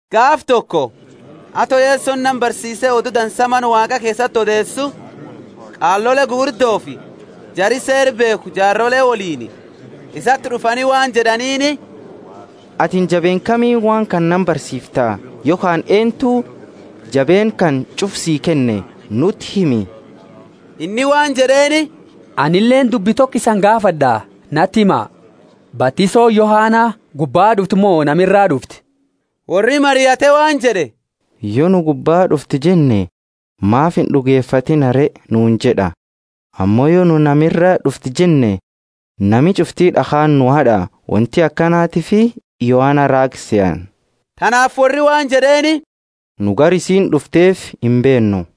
Gaafa toko, ato Yesoni nama barsiise Odu Dansa Mana Waaqa keesati odeesu, qaalole gugurdofi jari Seera beekhu jaarole woliini isati d'ufani waan jed'aniini, Atini jabeenna kamiini waan kana nama barsiifta yokhaani eennuti jabeenna kana ch'ufa sii kenne? Nuti himi! Inni waan jed'eeni, Anileeni dubbi toko isani gaafad'a, nati hima! Batisooni Yohana gubbaa d'ufte mo nama iraa d'ufte? Worri mariate waan jed'e, Yo nu, Gubbaa d'ufte jenne, Maafi ind'ugefatiina re? nuuni jed'a. Ammo yo nu, Nama iraa d'ufte jenne, nami ch'ufti d'akhaani nu had'a; wonti akanatiifi Yohana raaga sehani. Tanaafi worri waan jed'eeni, Nu gara isiini d'ufteefi imbeennu.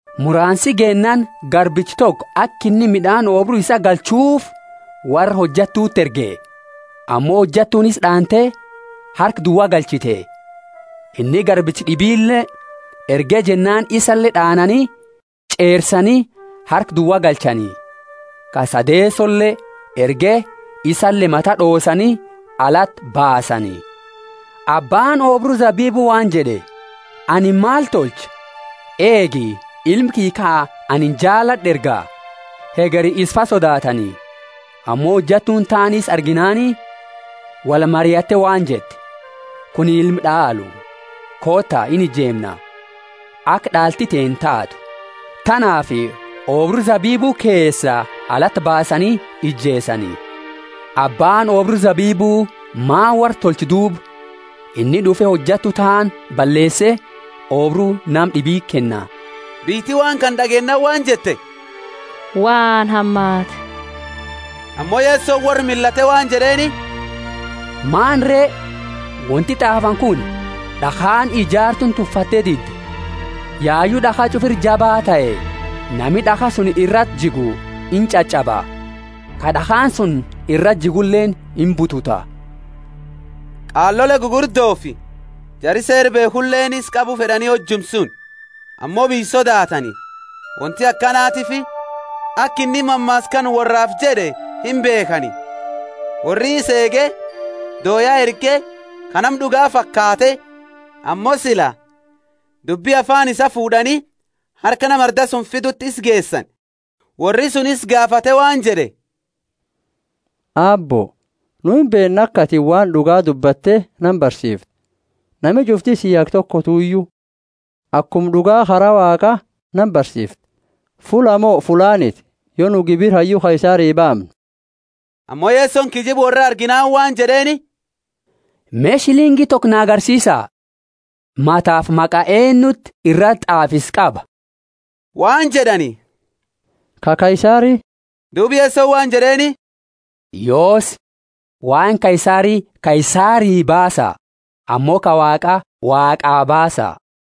Muraansi geennaani garbicha toko aka inni mid'aani oobru isaa galchuufi worra hojattuti erge. Ammo hojattuuni isa d'aante harka duwa galchite. Inni garbicha d'ibile erge jennaani isale d'aanani ch'eersani harka duwa galchani. Ka sadeesole erge isale mata d'oosani alati baasani. Abbaani oobru zabibu waan jed'e, Anini maal tolcha? Eegi, ilma kiyya ka anini jaalad'u erga; hegeri isafa sodaatani. Ammo hojattuuni taani isa arginaani wolmariatte waan jette, Kunini ilma d'aalu, koota, inijeemna, aka d'aalti teenna taatu. Tanaafi oobru zabibu keesa alati baasani ijeesani. Abbaani oobru zabibu maani worra tolcha duuba? Inni d'ufe hojattu taani balleese oobru nama d'ibiti kenna. Biyyiti waan kana d'ageennaani waan jette, Waan hamaati! Ammo Yesoni worra millate waan jed'eeni, Maani re, wonti t'aafani kuni? D'akhaani ijaartuuni tuffatte dide yayu d'akha ch'ufa ira jabaa tahe. Nami d'akha suni irati jigu inch'ach'aba, ka d'akhaani suni irati jiguleeni imbututa. Qaalole gugurdofi jari Seera beekhuleeni isa qabu fed'ani hojuma suni, ammo biyya sodaatani; wonti akanatiifi aka inni mammaasa kana worraafi jed'e imbeekhani. Worri isa eege, dooya erge, ka nama d'uga faakate, ammo sila dubbi afaani isaa fuud'ani harka nama arda suni fiduti isa geesani. Worri suni isa gaafate waan jed'e, Aabbo, nu imbeenna aka atini waan d'uga dubbatte nama barsiiftu, nami ch'ufti sii haga tokotuyu, akuma d'uga kara Waaqa nama barsiifta. Fullaa mo fullaaniti, yo nu gibira hayyu Kaisari baamnu? Ammo Yesoni kiyyiba worraa arginaani waan jed'eeni. Me, shilingi toko na agarsiisa. Matafi maqa eennuti irati t'aafisa qaba? Waan jed'ani, Ka Kaisari. Duuba Yesoni waan jed'eeni, Yoosi, waan Kaisari Kaisarii baasa, ammo ka Waaqa Waaqaa baasa.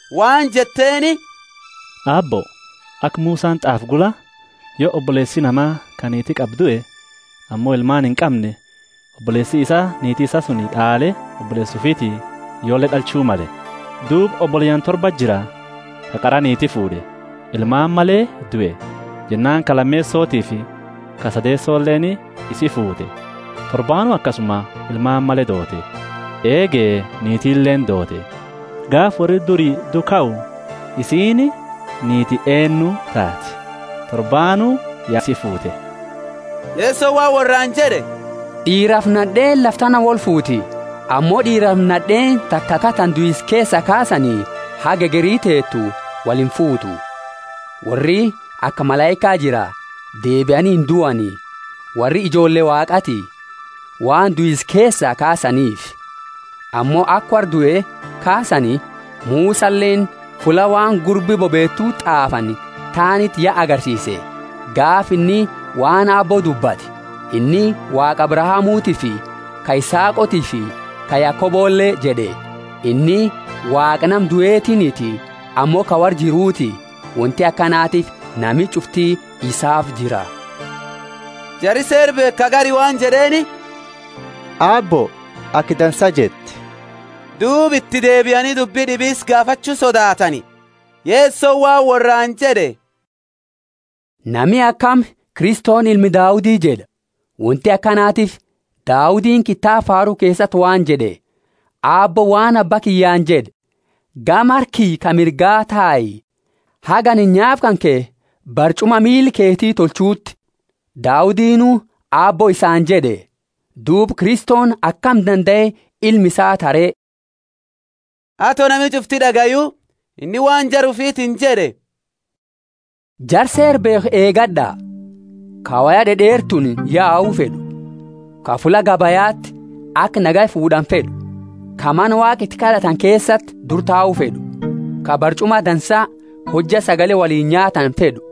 waan jetteeni, Aabbo, aka Musani t'aafe gula, yo oboleesi nama ka niiti qabu due, ammo ilmaani inqamne, oboleesi isaa niiti suni d'aale oboleesa ufiiti ijoolle d'alchu male. Duuba, oboleyaani torbati jira; ka qara niiti fuud'e, ilmaani male due. Jennaani ka lameesotifi ka sadeesoleeni isi fuute; torbaanu akasuma ilmaani male doote. Eege, niitileeni doote. Gaafa worri duri due kau, isiini niiti eennu taati? Torbaanu ya isi fuute. Yesoni waan worraani jed'e, D'iirafi nad'eeni lafa tana wolfuuti; ammo d'iirafi nad'eeni, ta taka tana duisa keesa kaasani, haga hegeri teetu, wolinfuutu. Worri aka malaika jira, deebiani induani. Worri ijoolle Waaqati, waan duisa keesaa kaasaniifi. Ammo aka worra due kaasani, Musaleeni, fulla waan gurbi bobeetu t'aafani taaniti ya agarsiise, gaafa inni waan Abbo dubbate, inni Waaqa Abrahamutiifi, ka Isaaqotiifi ka Yakobole jed'e. Inni Waaqa nama duetiiniti, ammo ka worra jiruti; wonti akanatiifi nami ch'ufti isaafi jira. Jari Seera beekhu ka gari waan jed'eeni, Aabbo, aka dansa jette. Duuba iti deebiani dubbi d'ibi isa gaafachu sodaatani. Yesoni waan worraani jed'e, Nami akami, Kristoni ilma Daudi jed'a? Wonti akanatiifi Daudini kitaaba Faaru keesati waan jed'e, Aabbooni waan Abba kiyyaani jed'e, Gama harka kiyya ka mirga tai, haga anini nyaapa kanke barch'uma miila keti tolchuuti. Daudinu, Aabbo isaani jed'e; duuba Kristoni akami dandae ilma isaa taha re? Ato nami ch'ufti d'agayu, inni waan jara ufitiini jed'e, Jara Seera beekhu eegad'a, ka woya d'ed'eertuuni yau fed'u, ka fulla gabayati aka nagaya fuud'ani fed'u, ka mana Waaqa iti kad'atani keesati dura tau fed'u, ka barch'uma dansa hojja sagale woliini nyaatani fed'u,